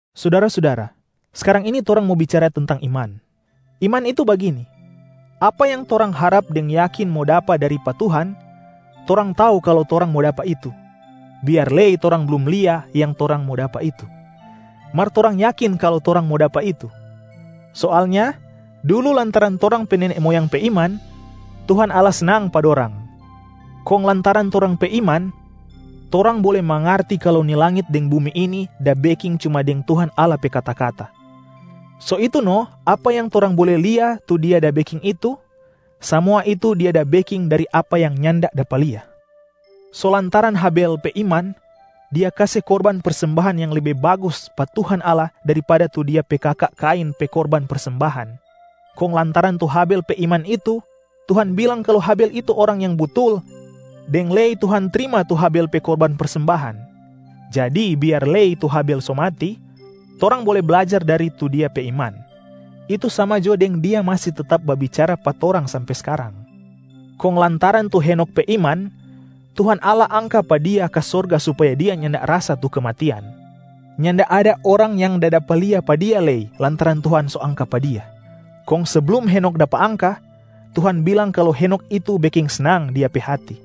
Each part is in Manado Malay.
Sudara-sudara, skarang ini torang mo bicara tentang iman. Iman itu bagini: apa yang torang harap deng yakin mo dapa dari pa Tuhan, torang tau kalu torang mo dapa itu, biar lei torang blum lia yang torang mo dapa itu, mar torang yakin kalu torang mo dapa itu. Soalnya dulu lantaran torang pe nene moyang pe iman Tuhan Allah snang pa dorang. Kong lantaran torang pe iman, torang bole mangarti kalu ni langit deng bumi ini da beking cuma deng Tuhan Allah pe kata-kata. So itu no apa yang torang bole lia tu Dia da beking itu, samua itu Dia da beking dari apa yang nyanda dapa lia. So lantaran Habel pe iman, dia kase korban persembahan yang lebe bagus pa Tuhan Allah daripada tu dia pe kaka Kain pe korban persembahan. Kong lantaran tu Habel pe iman itu, Tuhan bilang kalu Habel itu orang yang butul deng lei Tuhan trima tu Habel pe korban persembahan. Jadi biar lei tu Habel so mati, torang bole blajar dari tu dia pe iman, itu sama jo deng dia masi tetap da babicara pa torang sampe skarang. Kong lantaran tu Henokh pe iman, Tuhan Allah angka pa dia ka sorga supaya dia nyanda rasa tu kematian. Nyanda ada orang yang da dapa lia pa dia lei lantaran Tuhan so angka pa dia. Kong seblum Henokh dapa angka, Tuhan bilang kalu Henokh itu beking snang Dia pe hati.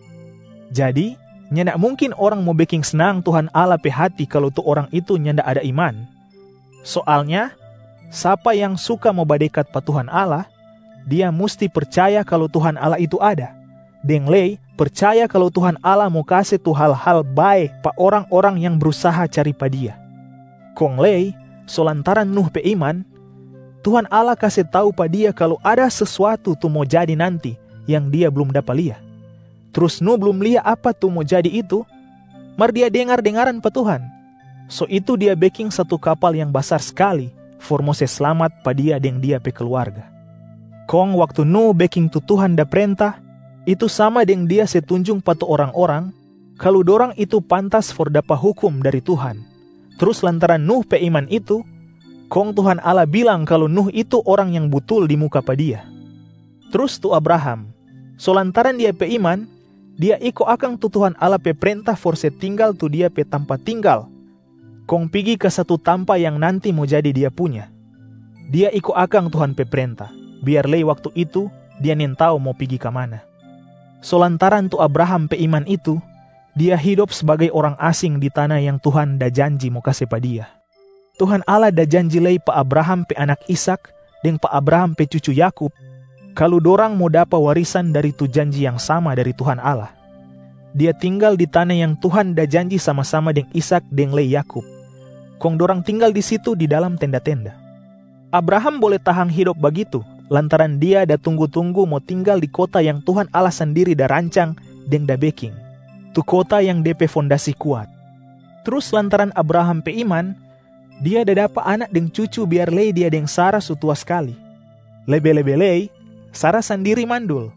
Jadi nyanda mungkin orang mo beking snang Tuhan Allah pe hati kalu tu orang itu nyanda ada iman. Soalnya sapa yang suka mo badekat pa Tuhan Allah, dia musti percaya kalu Tuhan Allah itu ada, deng lei percaya kalu Tuhan Allah mo kase tu hal-hal bae pa orang-orang yang brusaha cari pa Dia. Kong lei so lantaran Nuh pe iman, Tuhan Allah kase tau pa dia kalu ada sesuatu tu mo jadi nanti yang dia blum dapa lia. Trus Nuh blum lia apa tu mo jadi itu, mar dia dengar-dengaran pa Tuhan, so itu dia beking satu kapal yang basar skali for mo se slamat pa dia deng dia pe kluarga. Kong waktu Nuh beking tu Tuhan da prenta, itu sama deng dia se tunjung pa tu orang-orang kalu dorang itu pantas for dapa hukum dari Tuhan. Trus lantaran Nuh pe iman itu, kong Tuhan Allah bilang kalu Nuh itu orang yang butul di muka pa Dia. Trus tu Abraham, so lantaran dia pe iman, dia iko akang tu Tuhan Allah pe prenta for se tinggal tu dia pe tampa tinggal kong pigi ka satu tampa yang nanti mo jadi dia punya. Dia iko akang Tuhan pe prenta, biar lei waktu itu dia nintau mo pigi ka mana. So lantaran tu Abraham pe iman itu, dia hidop sbagai orang asing di tana yang Tuhan da janji mo kase pa dia. Tuhan Allah da janji lei pa Abraham pe anak Ishak deng pa Abraham pe cucu Yakub kalu dorang mo dapa warisan dari tu janji yang sama dari Tuhan Allah. Dia tinggal di tana yang Tuhan da janji sama-sama deng Ishak deng lei Yakub, kong dorang tinggal di situ di dalam tenda-tenda. Abraham bole tahang hidop bagitu lantaran dia da tunggu-tunggu mo tinggal di kota yang Tuhan Allah sandiri da rancang deng da beking, tu kota yang de pe fondasi kuat. Trus lantaran Abraham pe iman, dia da dapa anak deng cucu biar lei dia deng Sara so tua skali, lebe-lebe lei Sara sandiri mandul.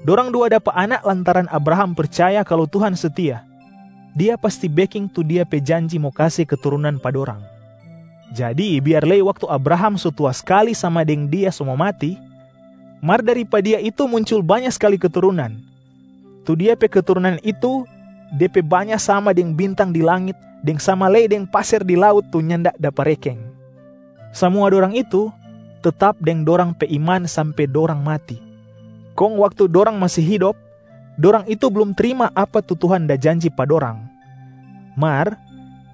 Dorang dua dapa anak lantaran Abraham percaya kalu Tuhan setia, Dia pasti beking tu Dia pe janji mo kase keturunan pa dorang. Jadi biar lei waktu Abraham so tua skali sama deng dia so mo mati, mar dari pa dia itu muncul banya skali keturunan. Tu dia pe keturunan itu de pe banya sama deng bintang di langit deng sama lei deng paser di laut tu nyanda dapa rekeng. Samua dorang itu tetap deng dorang pe iman sampe dorang mati, kong waktu dorang masi hidop dorang itu blum trima apa tu Tuhan da janji pa dorang. Mar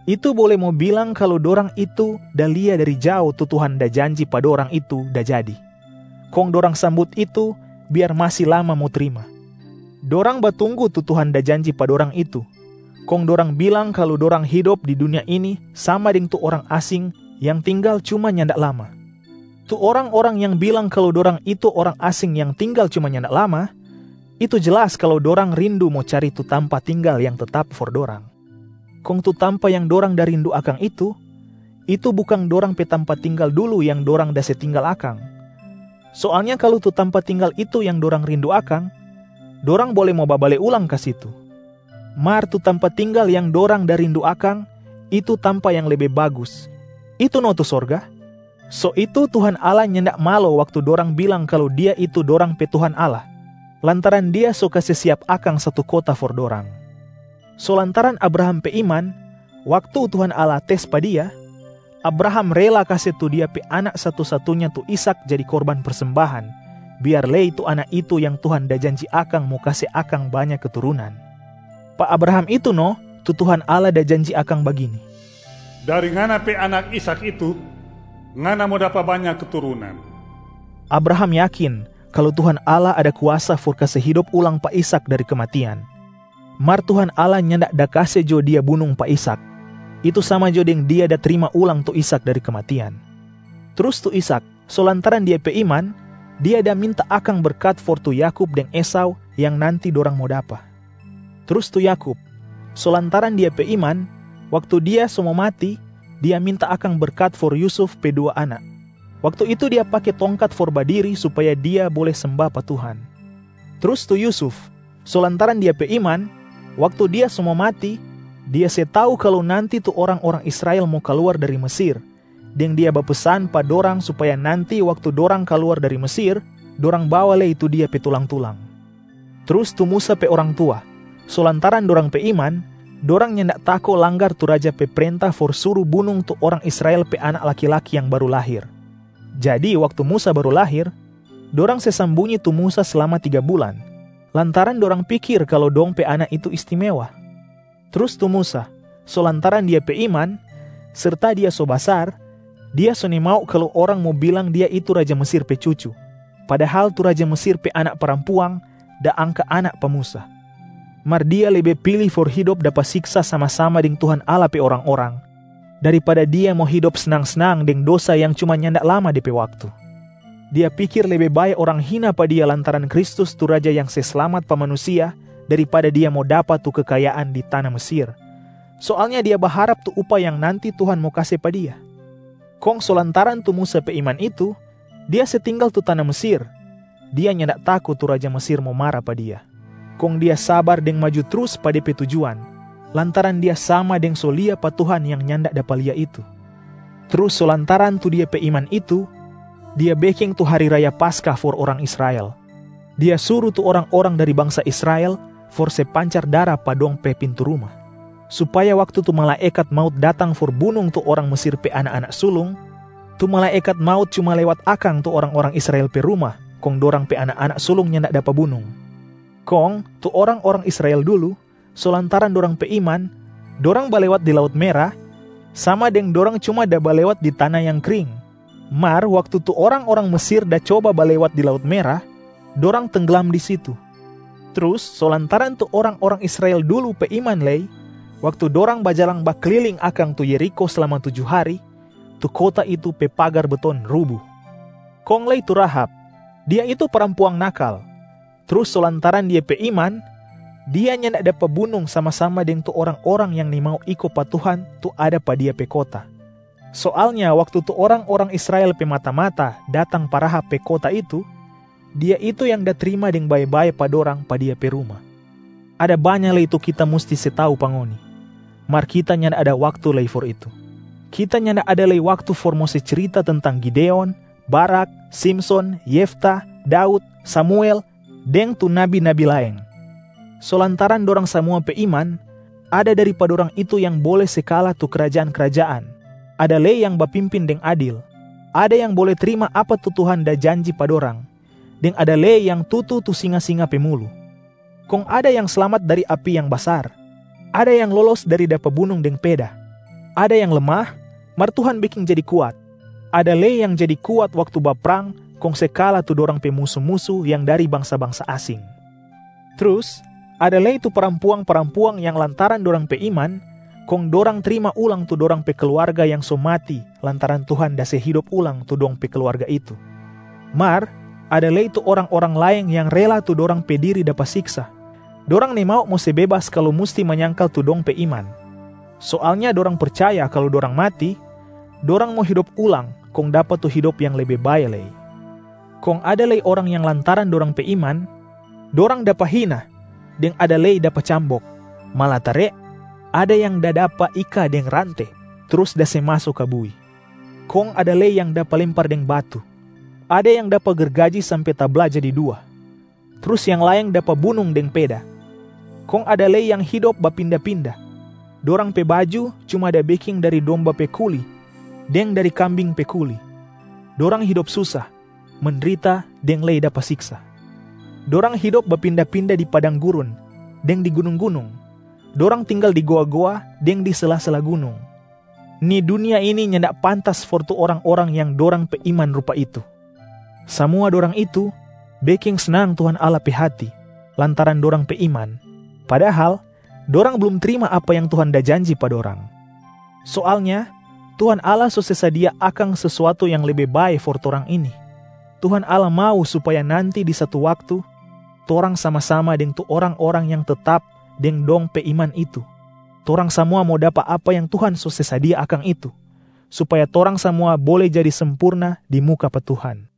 itu bole mo bilang kalu dorang itu da lia dari jao tu Tuhan da janji pa dorang itu da jadi, kong dorang sambut itu, biar masi lama mo trima. Dorang batunggu tu Tuhan da janji pa dorang itu, kong dorang bilang kalu dorang hidop di dunia ini sama deng tu orang asing yang tinggal cuma nyanda lama. Tu orang-orang yang bilang kalu dorang itu orang asing yang tinggal cuma nyanda lama, itu jelas kalu dorang rindu mo cari tu tampa tinggal yang tetap for dorang. Kong tu tampa yang dorang da rindu akang itu, itu bukang dorang pe tampa tinggal dulu yang dorang da se tinggal akang. Soalnya kalu tu tampa tinggal itu yang dorang rindu akang, dorang bole mo babale ulang ka situ. Mar tu tampa tinggal yang dorang da rindu akang, itu tampa yang lebe bagus, itu no tu sorga. So itu Tuhan Allah nyanda malo waktu dorang bilang kalu Dia itu dorang pe Tuhan Allah, lantaran Dia so kase siap akang satu kota for dorang. So lantaran Abraham pe iman, waktu Tuhan Allah tes pa dia, Abraham rela kase tu dia pe anak satu-satunya tu Ishak jadi korban persembahan, biar lei tu anak itu yang Tuhan da janji akang mo kase akang banya keturunan. Pa Abraham itu no tu Tuhan Allah da janji akang bagini, “Dari ngana pe anak Ishak itu, ngana mo dapa banya keturunan.” Abraham yakin kalu Tuhan Allah ada kuasa for kase hidop ulang pa Ishak dari kematian. Mar Tuhan Allah nyanda da kase jo dia bunung pa Ishak, itu sama jo deng dia da trima ulang tu Ishak dari kematian. Trus tu Ishak, so lantaran dia pe iman, dia da minta akang berkat for tu Yakub deng Esau yang nanti dorang mo dapa. Trus tu Yakub, so lantaran dia pe iman, waktu dia so mo mati, dia minta akang berkat for Yusuf pe dua anak, waktu itu dia pake tongkat for badiri supaya dia bole semba pa Tuhan. Trus tu Yusuf, so lantaran dia pe iman, waktu dia so mo mati, dia se tau kalu nanti tu orang-orang Israel mo kaluar dari Mesir, deng dia bapesan pa dorang supaya nanti waktu dorang kaluar dari Mesir, dorang bawa lei tu dia pe tulang-tulang. Trus tu Musa pe orang tua, so lantaran dorang pe iman, dorang nyanda tako langgar tu raja pe prenta for suru bunung tu orang Israel pe anak laki-laki yang baru lahir. Jadi waktu Musa baru lahir, dorang se sambunyi tu Musa slama tiga bulan lantaran dorang pikir kalu dong pe anak itu istimewa. Trus tu Musa, so lantaran dia pe iman, serta dia so basar, dia so nimau kalu orang mo bilang dia itu raja Mesir pe cucu, padahal tu raja Mesir pe anak parampuang da angka anak pa Musa. Mar dia lebe pili for hidop dapa siksa sama-sama deng Tuhan Allah pe orang-orang, daripada dia mo hidop snang-snang deng dosa yang cuma nyanda lama de pe waktu. Dia pikir lebe bae orang hina pa dia lantaran Kristus tu Raja yang se slamat pa manusia, daripada dia mo dapa tu kekayaan di tana Mesir. Soalnya dia baharap tu upah yang nanti Tuhan mo kase pa dia. Kong so lantaran tu Musa pe iman itu, dia se tinggal tu tana Mesir, dia nyanda tako tu raja Mesir mo mara pa dia. Kong dia sabar deng maju trus pa de pe tujuan, lantaran dia sama deng so lia pa Tuhan yang nyanda dapa lia itu. Trus so lantaran tu dia pe iman itu, dia beking tu hari raya Paskah for orang Israel. Dia suru tu orang-orang dari bangsa Israel for se pancar dara pa dong pe pintu ruma, supaya waktu tu malaekat maut datang for bunung tu orang Mesir pe anak-anak sulung, tu malaekat maut cuma lewat akang tu orang-orang Israel pe ruma kong dorang pe anak-anak sulung nyanda dapa bunung. Kong tu orang-orang Israel dulu, so lantaran dorang pe iman, dorang balewat di Laut Mera sama deng dorang cuma da balewat di tana yang kring. Mar waktu tu orang-orang Mesir da coba balewat di Laut Mera, dorang tengglam di situ. Trus so lantaran tu orang-orang Israel dulu pe iman lei, waktu dorang bajalang bakliling akang tu Yerikho slama tuju hari, tu kota itu pe pagar beton rubu. Kong lei tu Rahab, dia itu parampuang nakal, trus so lantaran dia pe iman, dia nyanda dapa bunung sama-sama deng tu orang-orang yang nimau iko pa Tuhan tu ada pa dia pe kota. Soalnya waktu tu orang-orang Israel pe mata-mata datang pa Rahab pe kota itu, dia itu yang da trima deng bae-bae pa dorang pa dia pe ruma. Ada banya lei tu kita musti se tau pa ngoni, mar kita nyanda ada waktu lei for itu. Kita nyanda ada lei waktu for mo se cirita tentang Gideon, Barak, Simson, Yefta, Daud, Samuel deng tu nabi-nabi laeng. So lantaran dorang samua pe iman, ada dari pa dorang itu yang bole se kala tu krajaan-krajaan, ada lei yang bapimpin deng adil, ada yang bole trima apa tu Tuhan da janji pa dorang, deng ada lei yang tutu tu singa-singa pe mulu. Kong ada yang slamat dari api yang basar, ada yang lolos dari dapa bunung deng peda, ada yang lemah mar Tuhan beking jadi kuat, ada lei yang jadi kuat waktu baprang kong se kala tu dorang pe musu-musu yang dari bangsa-bangsa asing. Trus ada lei tu parampuang-parampuang yang lantaran dorang pe iman, kong dorang trima ulang tu dorang pe kluarga yang so mati lantaran Tuhan da se hidop ulang tu dong pe kluarga itu. Mar ada lei tu orang-orang laeng yang rela tu dorang pe diri dapa siksa, dorang nimau mo se bebas kalu musti manyangkal tu dong pe iman. Soalnya dorang percaya kalu dorang mati, dorang mo hidop ulang kong dapa tu hidop yang lebe bae lei. Kong ada lei orang yang lantaran dorang pe iman, dorang dapa hina deng ada lei dapa cambok, malatare ada yang da dapa ika deng rante trus da se maso ka bui. Kong ada lei yang dapa lempar deng batu, ada yang dapa gergaji sampe tabla jadi dua, trus yang laeng dapa bunung deng peda. Kong ada lei yang hidop bapinda-pinda, dorang pe baju cuma yang da beking dari domba pe kuli deng dari kambing pe kuli. Dorang hidop susa, mendrita deng lei dapa siksa. Dorang hidop bapinda-pinda di padang gurun deng di gunung-gunung, dorang tinggal di goa-goa deng di sela-sela gunung. Ni dunia ini nyanda pantas for tu orang-orang yang dorang pe iman rupa itu. Samua dorang itu beking snang Tuhan Allah pe hati lantaran dorang pe iman, padahal dorang blum trima apa yang Tuhan da janji pa dorang. Soalnya Tuhan Allah so se sadia akang sesuatu yang lebe bae for torang ini. Tuhan Allah mau supaya nanti di satu waktu, torang sama-sama deng tu orang-orang yang tetap deng dong pe iman itu, torang samua mo dapa apa yang Tuhan so se sadia akang itu, supaya torang samua bole jadi sempurna di muka pa Tuhan.